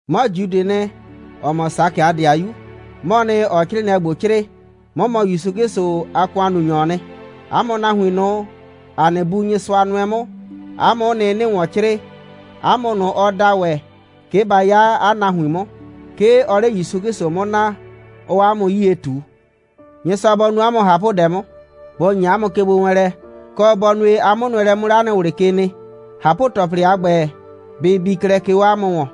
'Mɔ Judɩɩ nɩ, ‑ɔ mɔ Sakɩ a ‑dɩayu, 'mɔɔ nɩ, ‑ɔɔ 'crɩɩnɩɛ ‑gbo 'crɩɩ. 'Mɔ mɔ ‑Yusu 'Klɩsʋ a ‑kʋannunyɔɔ nɩ. 'A mʋ nahuin ꞊nʋ, ‑a nɩ Bu Nyɩsʋa nʋɛ 'mʋ, 'a mʋ'ʋ nɩ, 'nɩɩ ‑wɔn 'crɩɩ, 'a mʋ ꞊nʋ, ɔ da ‑wɛ, 'ke ba 'ya 'a nahuin 'mʋ. 'Ke ɔɔ 'le ‑Yusu 'Klɩsʋ 'mʋ naa, 'ɔɔ 'a mʋ 'yie ꞊tu. Nyɩsʋa bɔ nu 'a mʋ ꞊hapʋdɛ 'mʋ, bɔ ‑nyi 'a mʋ kegbowɛɛnlɛ, kɔ, bɔ nue, 'a 'mʋnʋɛlɛ 'mʋ 'le 'a nɩ ꞊wlɩ ke nɩ. ꞊Hapʋ‑tɔplɩ a ‑gbɛ, bɩ bii klɛ, 'ke 'o 'a mʋ ‑wɔn.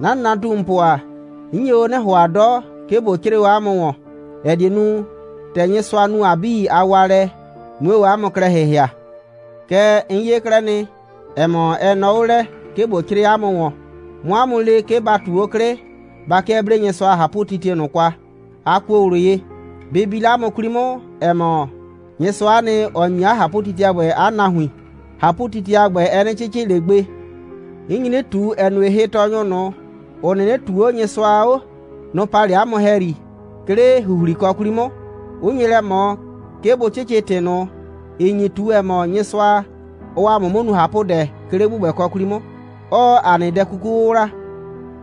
'Na nɩnatumupʋ ‑a, 'n nye o 'nɩ ‑hʋa 'dɔ, 'ke ꞊bo 'crɩɩ o 'a mʋ ‑wɔn, ‑ɛ die nu, ‑tɛ Nyɩsʋa nu ‑a 'bii a waalɛ, 'mue o 'a mʋ klɛ ‑hɩhɩa. Kɛɛ, 'n 'ye 'klɛɛ nɩ, ‑ɛ mɔ, ɛ nɔɔ 'o lɛ, 'ke ꞊bo 'crɩɩ 'a mʋ ‑wɔn, 'mʋ 'a mʋ le, 'ke ba ꞊tu 'o 'klɩ, ba 'kɩɛ 'blee Nyɩsʋa a ꞊hapʋtitie ꞊nʋ kwa, a kuo ꞊wlʋ ye. Bɩ bi 'le 'a mʋ 'kwli 'mʋ, ‑ɛ mɔ, Nyɩsʋa'a nɩ, ‑ɔ ‑nyi 'a ꞊hapʋtitie a ‑gbɛ 'a nahuin. ꞊Hapʋtitie a ‑gbɛ, ɛ 'nɩ 'cɩcɩ ꞊le gbe. 'N nyi 'nɩ ꞊tu, ‑ɛ nue, hɩtɔɔnyʋ ꞊nʋ, ‑ʋ 'nɩnɩ ꞊tuu 'o Nyɩsʋa 'o, nʋ‑ pa 'le 'a mʋ ‑hɛyri, 'ke 'le ‑huhlikɔ 'kwli 'mʋ, 'ʋ nye lɛ ꞊mɔ, 'ke bʋ 'cɩcɩ ‑tɩ ꞊nʋ, ‑ɩ nyi ꞊tu, ‑ɛ mɔ, Nyɩsʋa, ɔɔ ‑a mʋ 'mʋ nu ꞊hapʋdɛ, 'ke 'le ‑gbʋgbɛkɔ 'kwli 'mʋ, 'ɔɔ ‑a nɩ dɛ 'kuku 'wʋwla.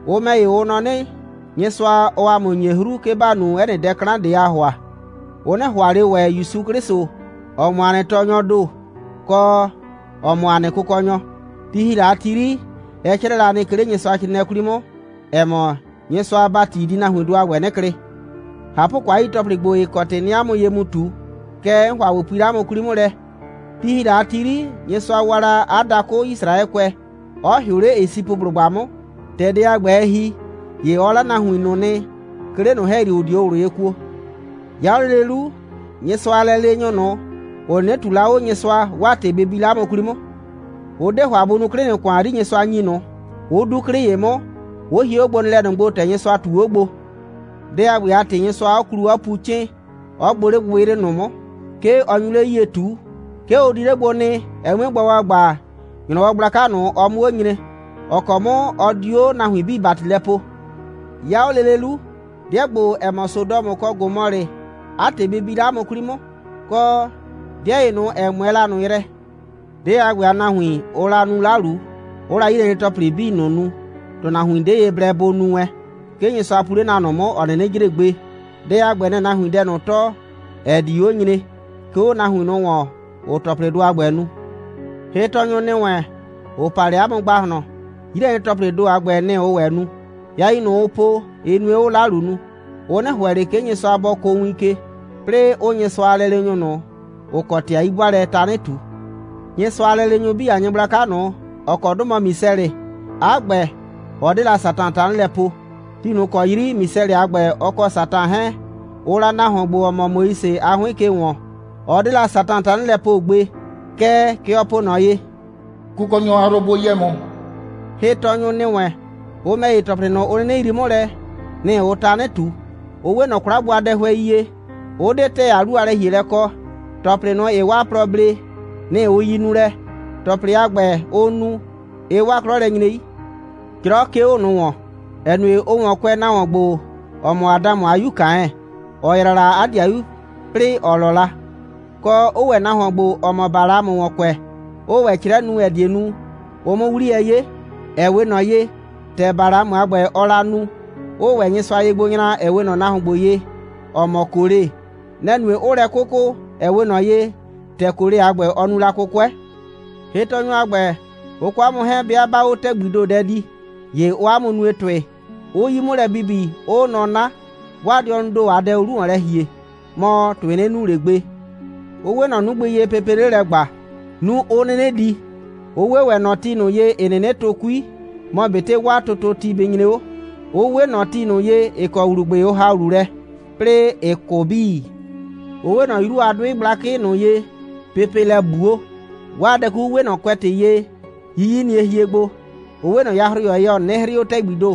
Ʋ ‑mɛ ‑ye, ʋ nɔ 'nɩ, Nyɩsʋa, ɔɔ ‑a mʋ ‑nyi 'hru, 'ke ‑ba nu 'ɛ nɩ dɛ 'klan ꞊de, ‑aa ‑hʋa. Ʋ 'nɩ ‑hʋa ꞊le ‑wɛ ‑Yusu 'Klɩsʋ, ‑ɔ mɔ ‑a nɩ Tɔɔnyɔɔ ‑do, kɔ, ‑ɔ mɔ ‑a nɩ Kʋkɔnyɔ. Ti ‑hi la a ti 'yri, ɛ 'crɛɛ la nɩ, 'ke 'le Nyɩsʋacrɩɩnɩɛ 'kwli 'mʋ, ‑ɛ mɔ, Nyɩsʋa a ‑bati di nahuindʋ a ‑gbɛ 'nɩ klɩ. ꞊Hapʋkɔ, 'a yi ‑tɔplɩ ‑gbo, ‑ɩ kɔ ‑tɩ 'nɩɩ 'a mʋ ye mu ꞊tu, kɛɛ, 'n ‑hʋa ꞊bo pui 'le 'a mʋ 'kwli 'mʋ lɛ. Ti ‑hi la a ti 'yri, Nyɩsʋa waa la 'a dakʋ Yisraɛkʋɛ, 'ɔ ‑hɩʋ 'le Esipʋblʋgba 'mʋ. ‑Tɛ dɛ a ‑gbɛ, ɛ ‑hi, ‑ye ɔ 'la nahuin ꞊nʋ nɩ, 'ke 'le ꞊nʋ ‑hɛyri, ‑ʋ 'dio ꞊wlʋ ye kuo. 'Ya 'o lele 'lu, Nyɩsʋa a lɛleenyʋ ꞊nʋ, ‑ʋ 'nɩnɩ ꞊tuu la 'o Nyɩsʋa, 'waa ‑tɩ bɩ bi 'le 'a mʋ 'kwli 'mʋ. Ʋ 'de ‑hʋa bʋ nuu 'klɩ ꞊nʋ ‑kʋan 'yri, Nyɩsʋa ‑nyi ꞊nʋ, 'ʋ 'du 'klɩ ‑ye 'mʋ, 'ʋ hie 'o gbonɩɩlɛ ꞊nʋ gbo, ‑tɛ ꞊nʋ, Nyɩsʋa ꞊tu 'o gbo. Dɛ a ‑gbɛ a ‑tɩ, Nyɩsʋa 'ɔ klu, 'ɔ pu 'cɩɩn, 'ɔ gbʋ 'le gbɩgbɩyrɩ ꞊nʋ 'mʋ. 'Ke ɔ nyu 'le 'yie ꞊tu. 'Ke ʋ di 'le gbo nɩ, ɛ 'mue gba ‑gbagba, ‑nyrɔwɔ gblaka ꞊nʋ, ɔ 'mʋ 'o nyre, ‑ɔ kɔ 'mʋ ɔ di 'o nahuin 'bii ‑bati lɛ poo. 'Ya 'o lele 'lu, 'dɩɛ ‑gbo, ‑ɛ mɔ Sodɔmʋ kɔ Gomɔlɩ, 'a ‑tɩ bɩ bi 'le 'a mʋ 'kwli 'mʋ, kɔ 'dɩɛ ‑ye ꞊nʋ, ‑ɛ 'mʋɛɛ la ꞊nʋ yrɛ. 'Dɩɛ a ‑gbɛ a nahuin, ʋʋ la nu 'lalu, 'ʋʋ la 'yilɛnyre‑tɔplɩ 'bii ꞊nʋ nu, ‑tʋnahuon 'de ye blɛ bɔ nu wɛn. 'Ke Nyɩsʋa pu 'le na ꞊nʋ 'mʋ, ‑ɔ 'nɩnɩ jre gbe. Dɛ a ‑gbɛ, nɛ‑ɛ nahuin dɛ ꞊nʋ tɔɔ, ‑ɛ di 'o nyre, 'ke 'o nahuin ꞊nʋ ‑wɔn, ‑ʋʋ ‑tɔplɩdʋ a ‑gbɛ nu. Hɩtɔɔnyʋ ‑nɩ wɛn, ‑ʋ pa 'le 'a mʋ ‑gbahlɔn, 'yilɛnyre‑tɔplɩɩ ‑do a ‑gbɛ, nɩ‑ ʋʋ ‑wɛ nu. Yain ꞊nʋ, ʋʋ po, ɩ nue, 'ʋʋ 'lalu nu. Ʋ 'nɩ ‑hʋɛ ꞊le, 'ke Nyɩsʋa bɔ kʋʋ win ke, 'plɩɩ 'ʋʋ Nyɩsʋa a lɛleenyʋ ꞊nʋ, ‑ʋ kɔ ‑tɩ a 'yi'bʋaalɛ tanɩ ꞊tu. Nyɩsʋa a lɛleenyʋ 'bii a nyɩgblaka ꞊nʋ, ‑ɔ kɔ 'dʋ mɔ Misɛlɩ, 'a ‑gbɛ, ɔ 'de la Satan tanɩ lɛ poo. Ti ꞊nʋ ‑kɔ 'yri Misɛlɩ a ‑gbɛ, ɔ kɔ Satan 'hɛɛn, ʋʋ la nahuon ‑gbo, ‑ɔ mɔ Moise a 'hʋɩn ke ‑wɔn, ɔ 'de la Satan tanɩ lɛ poo gbe. Kɛɛ, kɛ ɔ po ꞊nɔ ye: «Kʋkɔnyɔ a yrʋ bʋ yɛ ‑mʋ.» Hɩtɔɔnyʋ ‑nɩ wɛn, ʋ ‑mɛ ‑ye, ‑tɔplɩ ꞊nʋ, ʋ 'nɩnɩ yrii 'mʋ lɛ, nɩ‑ ʋʋ tanɩ ꞊tu. Ʋ 'we ꞊nɔ 'kwla gbo a dɛhʋɛi ye, 'ʋ 'de ‑tɛɛ a 'lu a lɛ‑hielɛ kɔ. ‑Tɔplɩ ꞊nʋ, ‑ɩɩ 'waa plɔ blee, nɩ‑ ʋ yi nulɛ. ‑Tɔplɩ a ‑gbɛ, ʋʋ nu, ɩɩ 'waa 'klɔ lɛ nyre 'yi. 'Jrɔ 'ke 'o ꞊nʋ ‑wɔn, ‑ɛ nue, ʋʋ ‑wɔn kʋɛ nahuon ‑gbo, ‑ɔ mɔ Adamʋ a 'yu Kaɛn, ‑ɔ yraa la 'a ‑dɩayu, 'plɩɩ ‑ɔ 'lɔ la; kɔ, 'ʋʋ ‑wɛ nahuon ‑gbo, ‑ɔ mɔ Balamʋ ‑wɔn kʋɛ, 'ʋʋ ‑wɛ 'crɛ nu, ‑ɛ die nu, ʋ 'mʋ 'wliyɛ 'ye, ‑ɛ 'we ꞊nɔ ye, ‑tɛ Balamʋ a ‑gbɛ, ɔɔ la nu, 'ʋʋ ‑wɛ Nyɩsʋa ye gbo nyra, ‑ɛ 'we ꞊nɔ nahuon ‑gbo ye, ‑ɔ mɔ Kole. Nɛ‑ nue, 'ʋʋ lɛ 'kʋkʋ, ‑ɛ 'we ꞊nɔ ye, ‑tɛ Kole a ‑gbɛ, ɔ nu la 'kʋkʋɛ. Hɩtɔɔnyʋ a ‑gbɛ, ʋ kɔ 'a mʋ 'hɛɛn, 'bɩa 'baa 'o ‑tɛgbii ‑do dɛ dii, ‑ye ʋʋ 'a mʋ nue ‑tʋɩ, 'ʋʋ 'yi 'mʋ lɛ bibi, 'ʋʋ nɔ 'na. 'Waa dɩɔnʋʋ ‑do a dɛ ʋʋ 'lu ‑wɔn lɛ ‑hie, mɔ, ‑tʋɩ 'nɩ nu ꞊le gbe. Ʋ 'we ꞊nɔ 'nugbɩ ye, pepee 'le lɛ ‑gba, 'nu 'ʋ 'nɩnɩ di. Ʋ 'we ‑wɛ ꞊nɔ ti ꞊nʋ ye, ‑ɩ 'nɩnɩ tʋ 'kui, mɔ ꞊betɩ 'waa tʋtʋti bɩ nyre 'o, 'ʋ 'we ꞊nɔ ti ꞊nʋ ye, ‑ɩ kɔ ‑wlubʋɩ ʋ ‑ha ‑wlu lɛ, 'plɩɩ ‑ɩ 'kʋ 'bii. Ʋ 'we ꞊nɔ 'yru a 'dʋɩ gblakɩ ꞊nʋ ye, pepee lɛ ꞊gbuo. 'Waa dɛ 'kuku 'we ꞊nɔ kʋɛtɩ ye, 'yiyinie hie gbo. Ʋ 'we ꞊nɔ yahroyɔ ye, ‑ɔ 'nɩnɩ 'hrɩɩ 'o ‑tɛgbii ‑do.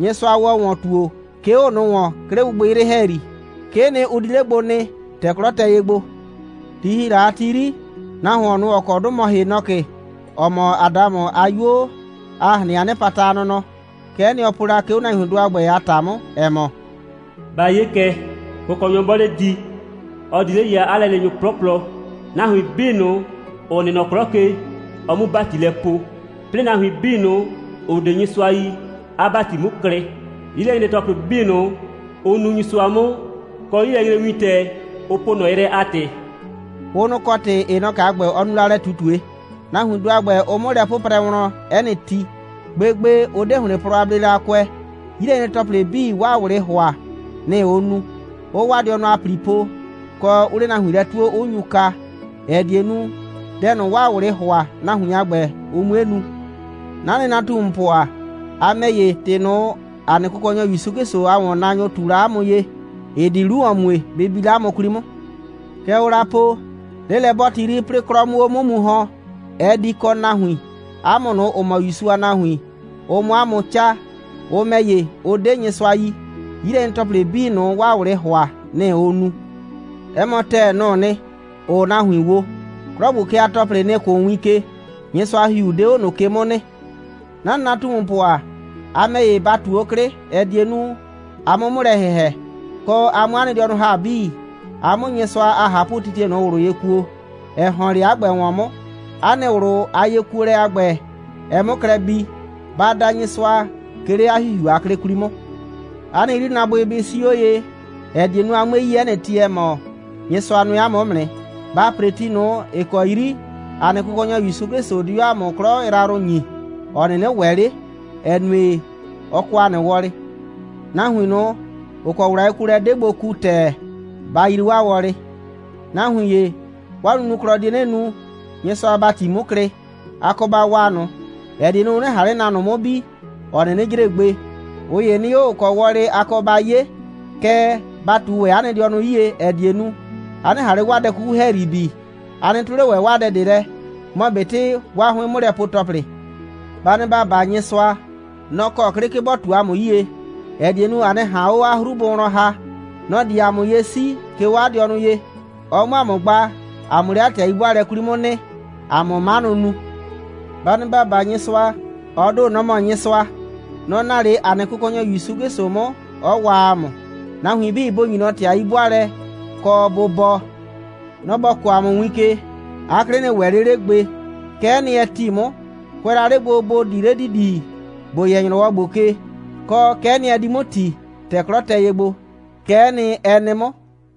Nyɩsʋa ‑wɔ ‑wɔn ‑tuo, 'ke 'o ꞊nʋ ‑wɔn, 'ke 'le gbɩgbɩyrɩ ‑hɛyri. 'Kee nɩ, ʋ di 'le gbo nɩ, ‑tɛ 'klɔ tɛ ye gbo. Ti ‑hi la a ti 'yri, nahuon ꞊nʋ, ‑ɔ kɔ 'dʋ mɔ Henɔkɩ, ‑ɔ mɔ Adamʋ a 'yuo a ꞊hrɩn a 'nɩpata a nɔnɔ, kɛ'ɛ nɩ, ɔ po la, 'ke 'o nahuindʋ a ‑gbɛ a ‑ta 'mʋ, ‑ɛ mɔ: «Ba 'ye kɛ, Kʋkɔnyɔ 'bɔɔ 'le di, ɔ di 'le ya 'a lɛleenyʋ 'plɔplɔ, nahuin 'bii ꞊nʋ, ‑ʋ nɩ nɔ 'klɔ ke, ɔ 'mu ‑bati lɛ poo, 'plɩɩ nahuin 'bii ꞊nʋ, ‑ʋ 'de Nyɩsʋa yi, 'a ‑bati 'mu klɩ, 'yilɛnyre‑tɔplɩ 'bii ꞊nʋ, ʋ nu Nyɩsʋa 'mʋ, kɔ 'yilɛnyrewintɛ, ʋ po ꞊nɔ yrɛ a ‑tɩ.» Ʋ nʋ‑ kɔ ‑tɩ Henɔkɩ a ‑gbɛ, ɔ nu lɛ ꞊tutue. Nahuindʋ a ‑gbɛ, ʋʋ 'mʋ lɛ 'pʋprɛ wlɔn 'ɛ nɩ ti. Gbegbe, ʋ 'de ‑hlɩn plɔ a bleelɛ a kʋɛ. 'Yilɛnyre‑tɔplɩ 'bii, 'waa ꞊wlɩɩ ‑hʋa, nɩ‑ ʋʋ nu, 'ʋʋ 'waa dɩɔnʋ a ‑pli po, kɔ, 'ʋʋ 'le nahuin lɛ 'tuo, 'ʋ nyu kaa, ‑ɛ die nu, dɛ ꞊nʋ, 'waa ꞊wlɩɩ ‑hʋa, nahuin a ‑gbɛ, ʋ 'mue nu. 'Na nɩnatumupʋ ‑a, a ‑mɛ ‑ye, ‑tɩ ꞊nʋ, ‑a nɩ Kʋkɔnyɔ ‑Yusu 'Klɩsʋ a ‑wɔnnaanyʋ ꞊tu la 'a mʋ ye, ‑ɩ di 'lu ‑wɔn mue, bɩ bi 'le 'a mʋ 'kwli 'mʋ. Kɛ ʋʋ la po, 'lelɛ'bɔɔti 'yri, 'plɩɩ 'klɔ 'mʋ 'o 'mʋ mu ‑hɔn, ɛ di kɔ nahuin, 'a mʋ ꞊nʋ, ‑ʋ mɔ ‑Yusu a nahuin, ʋ 'mʋ 'a mʋ 'caa. Ʋ ‑mɛ ‑ye, ʋ 'de Nyɩsʋa yi. 'Yilɛnyre‑tɔplɩ 'bii ꞊nʋ, 'waa ꞊wlɩɩ ‑hʋa, nɩ‑ ʋʋ nu. 'Ɛ mɔ ‑tɛɛ, nʋ‑ʋ nɩ, ‑ʋʋ nahuin wo. 'Klɔ ‑gbo ke a ‑tɔplɩ, nɩ‑ kʋʋ win ke. Nyɩsʋa a ‑Hihiu 'de 'o ꞊nʋ ke 'mʋ nɩ. 'Na nɩnatumupʋ ‑a, a ‑mɛ ‑ye, ba ꞊tu 'o 'klɩ, ‑ɛ die nu, a 'mʋ 'mʋ lɛ ‑hɩhɛ, kɔ, a 'mʋ 'a nɩ dɩɔnʋ ‑ha 'bii, a 'mʋ Nyɩsʋa a ꞊hapʋtitie ꞊nʋ ꞊wlʋ ye kuo, ‑ɛ ‑hɔn 'le 'a ‑gbɛ ‑wɔn 'mʋ, 'a nɩ ꞊wlʋ a yekuolɛ a ‑gbɛ, ɛ 'mʋ klɛ bii. Ba da Nyɩsʋa, 'ke 'le 'a ‑Hihiu a 'klɩ 'kwli 'mʋ. 'A nɩ 'yrinaabʋɩ bɩ 'sii 'o ye, ‑ɛ die nu, a 'mue yi 'ɛ nɩ ti, ‑ɛ mɔ, Nyɩsʋa nʋɛ 'a mʋ 'mʋ nɩ. Ba ‑pre ti ꞊nʋ, ‑ɩ kɔ 'yri ‑a nɩ Kʋkɔnyɔ ‑Yusu 'Klɩsʋ di 'o ‑a mʋ 'klɔ yrayrʋ ‑nyi, ‑ɔ 'nɩnɩ ‑wɛ 'le, ‑ɛ nue, ɔ kɔ ‑a nɩ wɔlɩ. Nahuin ꞊nʋ, ‑ʋ kɔ ꞊wlʋ a yekuolɛ 'de gbo ku ‑tɛɛ, ba yrii 'waa wɔlɩ. Nahuin ‑ye, 'waa nunuklɔ die 'nɩ nu, Nyɩsʋa a ‑bati 'mu klɩ. A kɔ ba waa ꞊nʋ, ‑ɛ die nu, ʋ 'nɩ ꞊han 'le na ꞊nʋ 'mʋ bi, ‑ɔ 'nɩnɩ jre gbe. ꞊Ʋ ‑ye nɩ 'o, ‑ʋ kɔ wɔlɩ a kɔ ba 'ye, kɛɛ, ba ꞊tu ‑wɛ 'a nɩ dɩɔnʋ 'yie, ‑ɛ die nu, a 'nɩ ꞊han 'le 'waa dɛ 'kuku ‑hɛyri bi. A nɩ 'tʋ 'le ‑wɛ 'waa dɛ ꞊de lɛ, mɔ ꞊betɩ 'waa 'hʋɩn'mʋlɛpue‑tɔplɩ. Ba nɩ ‑ba baa Nyɩsʋa. Nɔ‑ kɔ 'klɩ, 'ke bɔ ꞊tu 'a mʋ 'yie, ‑ɛ die nu, a 'nɩ ꞊han 'o 'a 'hru bʋ wlɔn ‑ha. Nɔ‑ di 'a mʋ ye 'sii, 'ke 'o 'a dɩɔnʋ ye, ɔ 'mʋ 'a mʋ gba, a 'mʋ 'le 'a ‑tɩ a 'yi'bʋaalɛ 'kwli 'mʋ nɩ, a 'mʋ 'manʋ nu. Ba nɩ ‑ba baa Nyɩsʋa. Ɔ ‑do, nɔ‑ mɔ Nyɩsʋa. Nɔ‑ naa 'le ‑a nɩ Kʋkɔnyɔ ‑Yusu 'Klɩsʋ 'mʋ, 'ɔ waa ‑a mʋ. Nahuin 'bii bʋ ‑nyi ꞊nɔ ‑tɩ a 'yi'bʋaalɛ, kɔ, bʋ bɔɔ. Nɔ‑ ‑bɔ kɔɔ ‑a mʋ win ke. 'A 'klɩ 'nɩ ‑wɛ ꞊le 'le gbe. Kɛ'ɛ nɩ, ɛ ‑ti 'mʋ, kʋɛ la 'le gbo, ‑bo di 'le ‑didi, ‑bo yɛ ‑nyrɔwɔ ‑gbo ke. Kɔ, kɛ'ɛ nɩ, ɛ di 'mʋ ‑ti, ‑tɛ 'klɔ tɛ ye gbo. Kɛ'ɛ nɩ, ɛ nɩ 'mʋ.